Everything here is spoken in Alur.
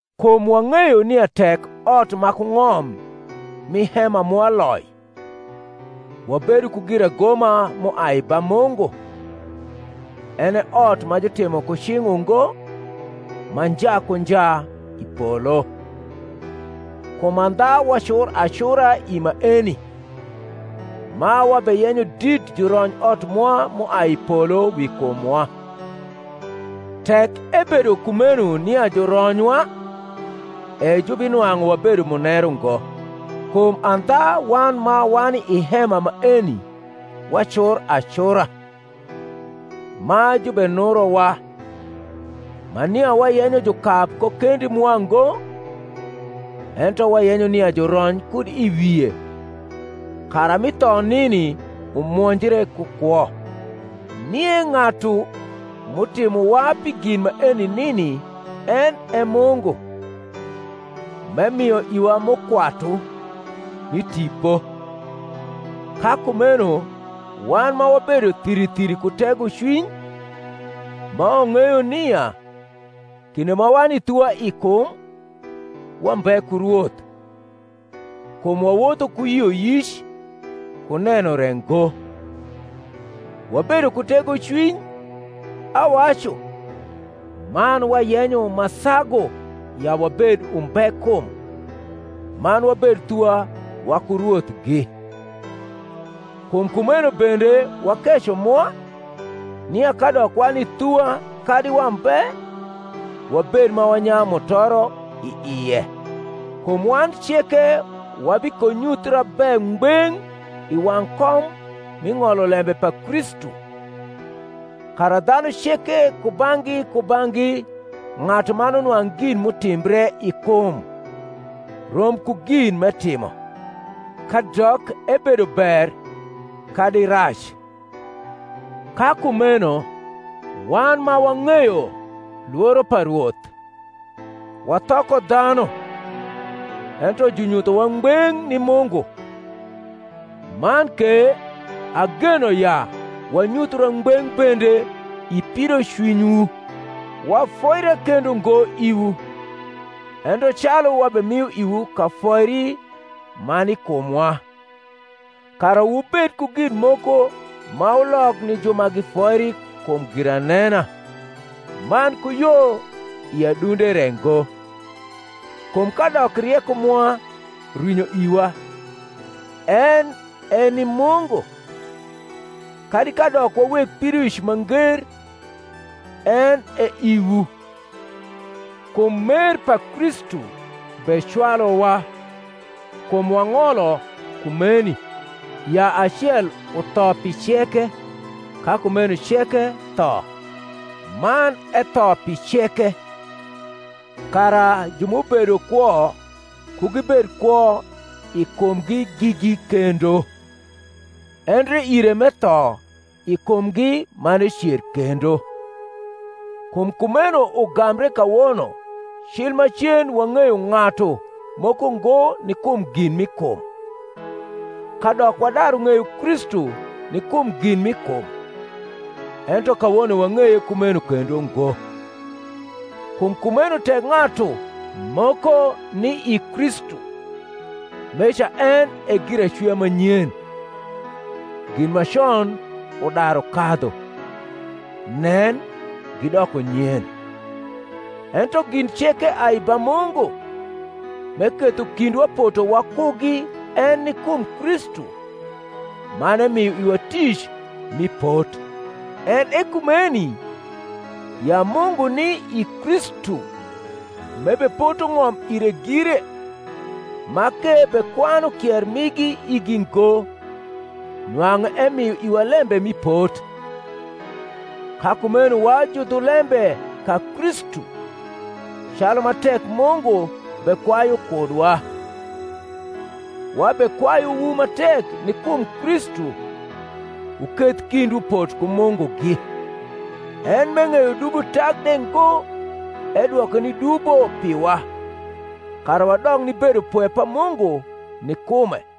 Kum wang’eyo nia tek ot ma ku ng’om mi hema mwa loi, wabedo ku giragoma m’uai ba Mungu, en e ot ma jutimo ku cing’ ungo, ma nja ku nja, i polo. Kum andha wacur acura i maeni, ma wabeyenyo dit jurony ot mwa m’uai i polo wi kumwa: tek ebedo kumeno nia juronywa e jubinwang’u wabedo muneru ngo. Kum andha wan ma wani i hema maeni wacur acura, ma jubenurowa; ma nia wayenyo jukab ko kendi mwa ngo, ento wayenyo nia jurony kud i wie, kara mi tho nini umwonjre ku kwo. Nie ng’atu m’utimowa pi gin maeni nini en e Mungu, m’emio iwa mukwatu mi Tipo. Ka kumeno wan ma wabedo thiri thiri ku tegocwiny, ma wang’eyo nia, kinde ma wani thuwa i kum, wambe ku Rwoth (kum wawotho ku yioyic, ku neno re ngo); wabedo ku tegocwiny, awacu, man wayenyo ma sagu ya wabed umbe kum, man wabed thuwa waku Rwothgi. Kum kumeno bende wakeco mwa, nia kadok wani thuwa kadi wambe, wabed ma wanyayu mutoro i ie. Kum wan ceke wabikonyuthra be ngbeng’ i wang’ kom mi ng’olo lembe pa Kristu; kara dhanu ceke kubang’gi kubang’gi ng’atuman unwang’ gin m’utimbre i kum, rom ku gin m’etimo, kadok ebedo ber kadi rac. Ka kumeno wan ma wang’eyo lworo pa Rwoth, wathoko dhanu, ento junyuthowa ngbeng’ ni Mungu; man ke ageno ya wanyuthra ngbeng’ bende i pidocwinywu. Wafoira kendo ngo iwu, ento calu wabemio iwu kafoiri ma ni kumwa, kara wubed ku gin moko ma wulok ni ju ma gifoiri kum giranena, man ku yo i adunde re ngo. Kum kadok rieko mwa rwinyo iwa, en e ni Mungu; kadi kadok wa weg pidoic ma nger, en e iwu. Kum mer pa Kristu becwaluwa; kum wang’olo kumeni, ya acel utho pi ceke, ka kumeno ceke tho; man etho pi ceke, kara ju m’ubedo kwo ku gibed kwo i kumgi gigi kendo, endre ire m’etho i kumgi man ecer kendo. Kum kumeno ugambre kawono cil macen wang’eyo ng’atu moko ngo ni kum gin mi kum: kadok wadaru ng’eyo Kristu ni kum gin mi kum, ento kawono wang’eye kumeno kendo ngo. Kum kumeno tek ng’atu moko ni i Kristu, meca en e giracwia ma nyen: gin ma con udaru kadhu; nen, gidoko nyen. Ento gin ceke ai ba Mungu, m’eketho kindwa poto wakugi en ni kum Kristu, man emio iwa tic mi pot; en e kumeni, ya Mungu ni i Kristu m’ebepoto ng’om ire gire, ma k’ebekwanu kier migi igi ngo, nwang’u emio iwa lembe mi pot. Ka kumeno wa judhulembe ka Kristu, calu ma tek Mungu bekwayu kudwa: wabekwayuwu ma tek ni kum Kristu, wuketh kindwu pot ku Mungugi. En m’eng’eyo dubo tak de ngo edwoke ni dubo piwa; kara wadok ni bedopwe pa Mungu ni kume.